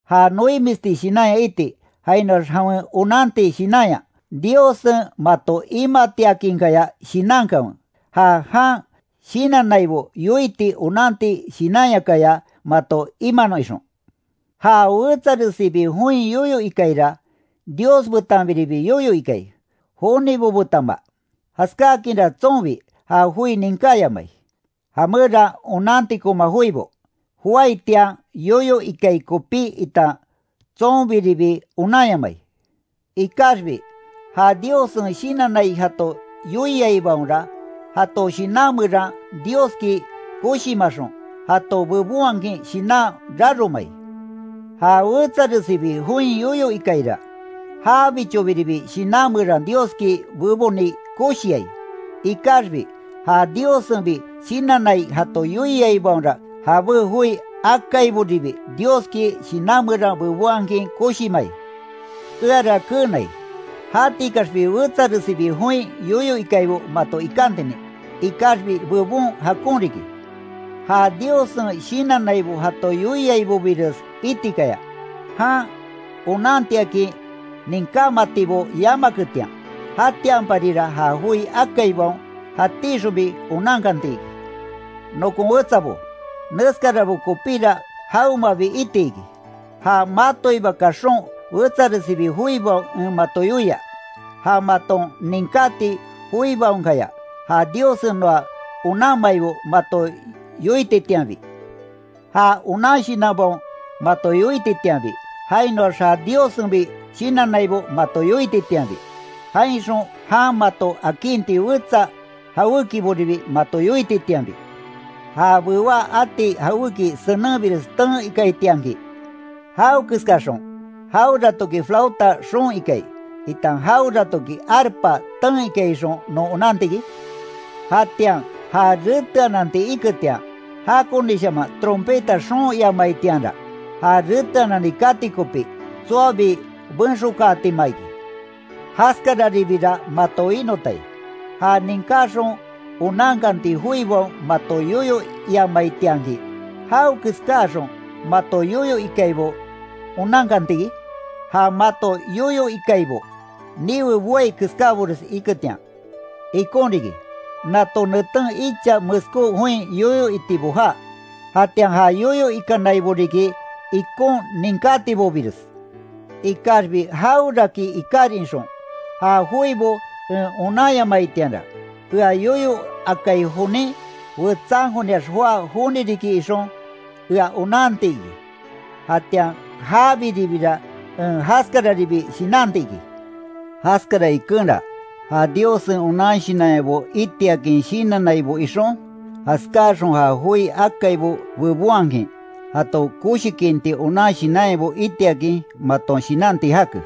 Ja noimisti shinanya iti, jainoax jawen onanti shinanya, Diossen mato imatiakinkaya shinankanwe, ja jan shinannaibo yoiti onanti shinanyakaya, mato imanon ixon. Ja wetsaresibi join yoyo ikaira, Dios betanbiribi yoyo ikai, jonibo betanma, jaskakinra tsonbi, ja joi ninkáyamai, jameran onantikoma joibo, joaitian yoyo ikai kopí itan tsonbiribi onanyamai. Ikaxbi, ja Diossen shinannai jato yoiaibaonra, jato shinan meran Dioski koshimaxon, jato bebonhakin shinan raromai. Ja wetsaresibi join yoyo ikaira, jabichobiribi shinan meran Dioski beboni koshiai, ikaxbi ja Diossenbi shinannai jato yoiaibaonra jabé joi akaiboribi Dioski shinan meran bebonhakin koshimai. Eara keenai, jatikaxbi wetsaresibi join yoyo ikaibo mato ikantinin, ikaxbi bebon jakon riki, ja Diossen shinannaibo jato yoiaibobires itikaya, jan onantiakin ninkámatibo yamaketian. Jatianparira ja joi akaibaon jatíxonbi onankanti iki. Nokon wetsabo, neskarabo kopíra jawemabi iti iki, ja matoiba kaxon wetsaresibi joibaon en mato yoia, ja maton ninkáti joibaonkaya, ja Diossen noa onanmaibo mato yoititianbi, ja onan shinanbaon mato yoititianbi, jainoax ja Diossenbi shinannaibo mato yoititianbi, jainxon jan mato akinti wetsa jawékiboribi mato yoititianbi. Ja bewá ati jawéki senenbires ten ikaitianki ¿Jawekeskaxon, jaweratoki flauta xoon ikai, itan jaweratoki arpa, ten ikai ixon non onanti iki? Jatian ja reteananti iketian, jakonishaman trompeta xoon iamaitianra, ja reteanani kati kopí, tsoabi benxokaatima iki. Jaskararibira mato winotai, ja ninkáxon onankati joibaon mato yoyo iamaitianki, ¿Jawekeskaxon mato yoyo ikaibo onankanti iki? Ja mato yoyo ikaibo niwe boai keskábores iketian. Ikon riki, nato neten icha meskó join yoyo itibo jaa, jatian ja yoyo ikanaibo riki ikon ninkátibobires, ikaxbi jaweraki ikarin ixon, ja joibo en onanyamaitianra, ea yoyo akai jonin, wetsankoniax joá joni riki ixon, ea onanti iki, jatian jabiribira en jaskararibi shinanti iki. Jaskara ikenra, ja Diossen onan shinanyabo itiakin shinannaibo ixon, jaskáaxon ja joi akaibo bebonhakin, jato koshikinti onan shinanyabo itiakin maton shinanti jake.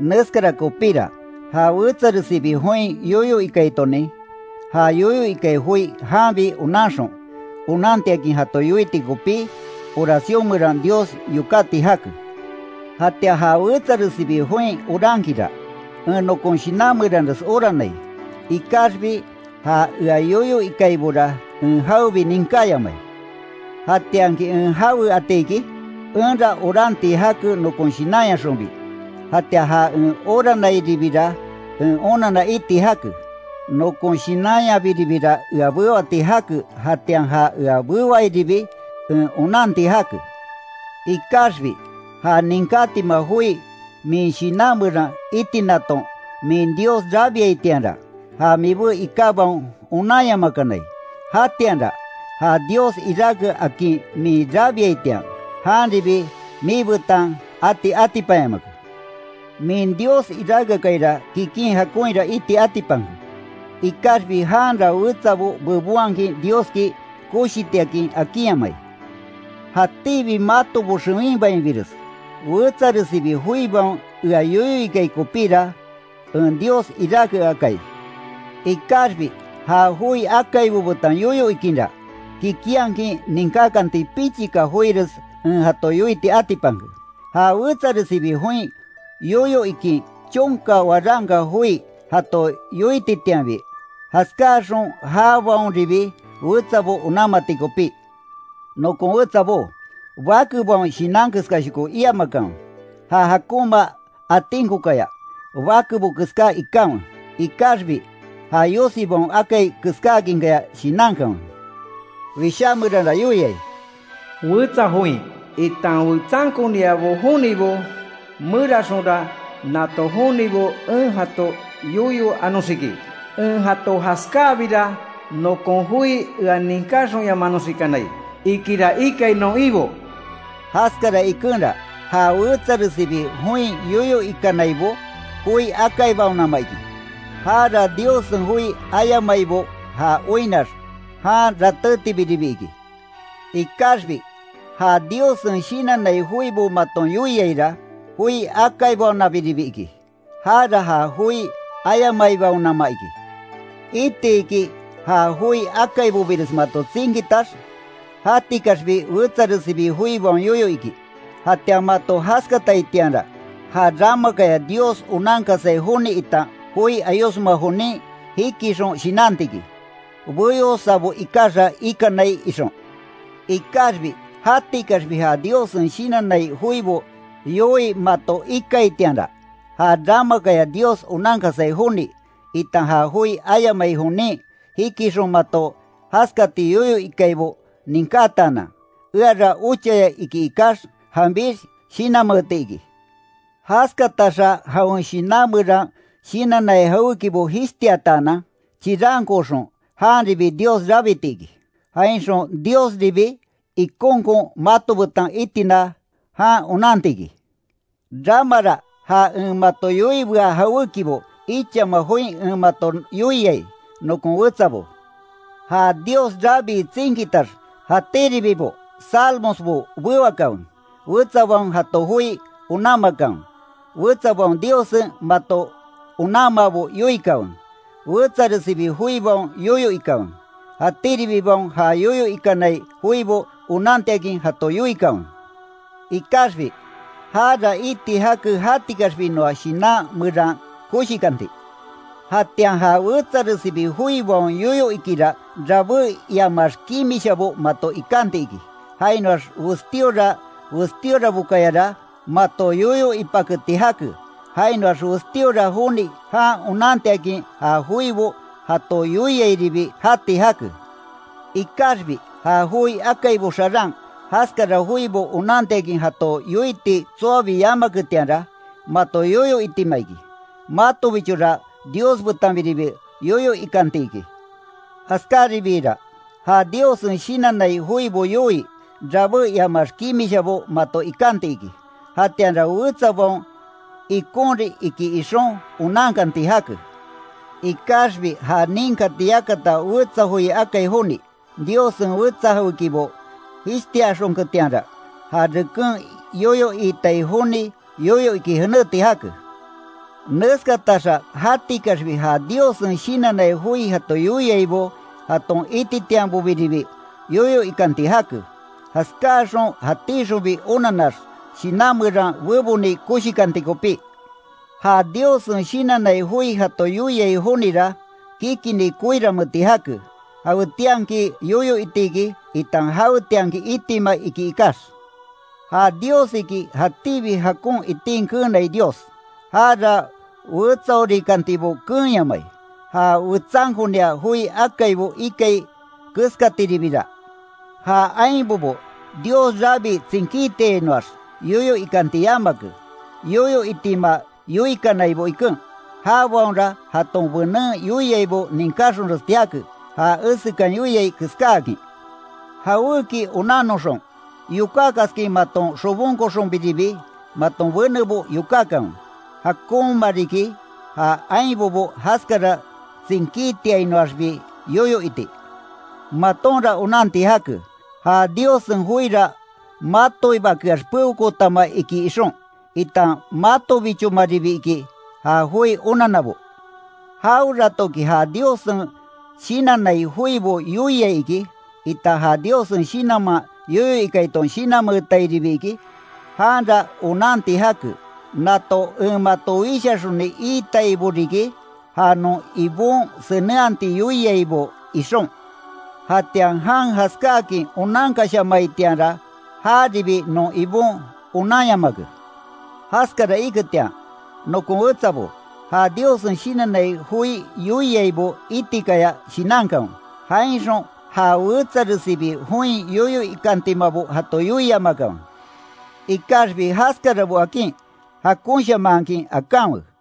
Neskara kopíra, ja wetsaresibi join yoyo ikaitonin, já yoyo ikai joi janbi onanxon, onantiakin jato yoiti kopí, oracion meran Dios yokáti jake. Jatian ja wetsaresibi join orankinra, en nokon shinan meranres oranai, ikaxbi ja ea yoyo ikaibora en jawebi ninkáyamai. ¿Jatianki en jawe ati iki? Enra oranti jake nokon shinanyaxonbi, jatian ja en oranairibira en onanna iti jake. Nokon shinanyabiribira ea bewati jake jatian ja ea bewairibi en onanti jake. Ikaxbi ja ninkátima joi min shinan meran itinaton min Dios rabiaitianra, ja mibé ikábaon onanyamakanai, jatianra, ja Dios iráke akin min rabiaitian, janribi miibetan ati atipanyamake. Min Dios iráke akaira kikin jakonhira iti atipanke, ikaxbi janra wetsabo bebonhakin Dioski koshitiakin akinyamai. Jatíbi matobo xewinbainbires wetsaresibi joibaon ea yoyo ikai kopíra en Dios iráke akai. Ikaxbi ja joi akaibo betan yoyo ikinra, kikinhakin ninkákanti pichika joires en jato yoiti atipanke, ja wetsaresibi join yoyo ikin chonka waranka joi jato yoititianbi, jaskáaxon jabaonribi wetsabo onanmati kopí, Nokon wetsabó, bakebaon shinan keskashoko iamakanwe, ja jakonma atinkokaya, bakebo keská ikanwe. Ikaxbi, ja yosibaon akai keskáakinkaya shinankanwe. Wishá meranra yoiai: “Wetsa join, itan wetsankonia jonibo meranxonra nato jonibo en jato yoyo anoxiki, en jato jaskáakabira, nokon joi ea ninkáxonyamanoxikanai, ikira ikai non Ibo”. Jaskara ikenra, ja wetsaresibi join yoyo ikanaibo, joi akaibaonama iki, jara Diossen joi ayamaibo ja oinnax, jan ratétibiribi iki. Ikaxbi ja Diossen shinannai joibo maton yoiaira, joi akaibaonabiribi iki, jara ja joi ayamaibaonama iki. Itiki ja joi akaibobires mato tsinkitax, jatikaxbi wetsaresibi joibaon yoyo iki, jatian mato jaskataitianra, ja ramakaya Dios onankasai joni itan joi ayosma jonin jikixon shinanti iki, beyosabo ikaxa ikanai, ixon. Ikaxbi jatikaxbi ja Diossen shinannai joibo yoii mato ikaitianra, ja ramakaya Dios onankasai joni, itan ja joi ayamai jonin, jikixon mato jaskati yoyo ikaibo ninkátaanan, eara ochaya iki ikax, janbix shinanmeeti iki. Jaskataxa jawen shinan meran shinannai jawékibo jishtiataanan, chirankooxon, janribi Dios rabiti iki, jainxon Diosribi ikonkon mato betan itina, jan onanti iki. Ramara ja en mato yoiibea jawékibo ichama join en mato yoiai, nokon wetsabo, ja Dios rabii tsinkitax jatíribibo salmosbo bewakanwe, wetsabaon jato joi onanmakanwe, wetsabaon Diossen mato onanmaabo yoikanwe, wetsaresibi joibaon yoyo ikanwe, jatíribibaon ja yoyo ikanai joibo onantiakin jato yoikanwe, ikaxbi, jara iti jake jatikaxbi noa shinan meran koshikanti. Jatian ja wetsaresibi joibaon yoyo ikira rabé iamax kimishabo mato ikanti iki, jainoax westíora westíorabokayara, mato yoyo ipaketi jake, jainoax westíora joni jan onantiakin ja joibo jato yoiairibi jati jake. Ikaxbi ja joi akaibo xaran jaskara joibo onantiakin jato yoiti tsoabi yamaketianra, mato yoyo itima iki, matobichora Dios betanbiribi yoyo ikanti iki. Jaskaribiira, ja Diossen shinannai joibo yoii, rabé iamax kimishabo mato ikanti iki, jatianra wetsabaon, ikonrin iki ixon, onankanti jake. Ikaxbi ja nínkati yakata wetsa joi akai joni, Diossen wetsa jawékibo jishtiaxonketianra, ja reken yoyo iitai joni yoyo iki jenéti jake. Neskataxa jatikaxbi ja Diossen shinannai joi jato yoiaibo jaton ititianbobiribi, yoyo ikanti jake, jaskáaxon jatíxonbi onanax, shinan meran beboni koshikanti kopí. Ja Diossen shinannai joi jato yoiai jonira, kikini koiranmeeti jake, jawetianki yoyo itiki, itan jawetianki itima iki, ikax. Ja Dios iki jatíbi jakon itin keenai Dios, jara wetsaorikantibo keenyamai. Ja wetsankonia joi akaibo ikai keskatiribira, ja ainbobo Dios rabii tsinkítiainoax yoyo ikanti yamake, yoyo itima yoikanaibo iken, jabaonra jaton benen yoiaibo ninkáxonresti jake, ja esekan yoiai keskáakin. Jawéki onannoxon, yokákaskin maton xobonkoxonbiribi, maton benebo yokákanwe, jakonma riki, ja ainbobo jaskara tsinkítiainoaxbi yoyo iti. Matonra onanti jake, ja Diossen joira matoibakeax peokootama iki ixon, itan matobichomaribi iki, ja joi onanabo. Jaweratoki ja Diossen shinannai joibo yoiai iki, itan ja Diossen Shinanman yoyo ikaiton shinanmeetairibi iki, janra onanti jake, nato en mato wishaxoni iitaibo riki, ja non Ibon senenhati yoiaibo, ixon. Jatian jan jaskáakin onankashamaitianra, jaribi non Ibon onanyamake. Jaskara iketian, nokon wetsabo, ja Diossen shinannai joi yoiaibo itikaya shinankanwe, jainxon ja wetsaresibi join yoyo ikantimabo jato yoiamakanwe. Ikaxbi jaskarabo akin, jakonshamanhakin akanwe.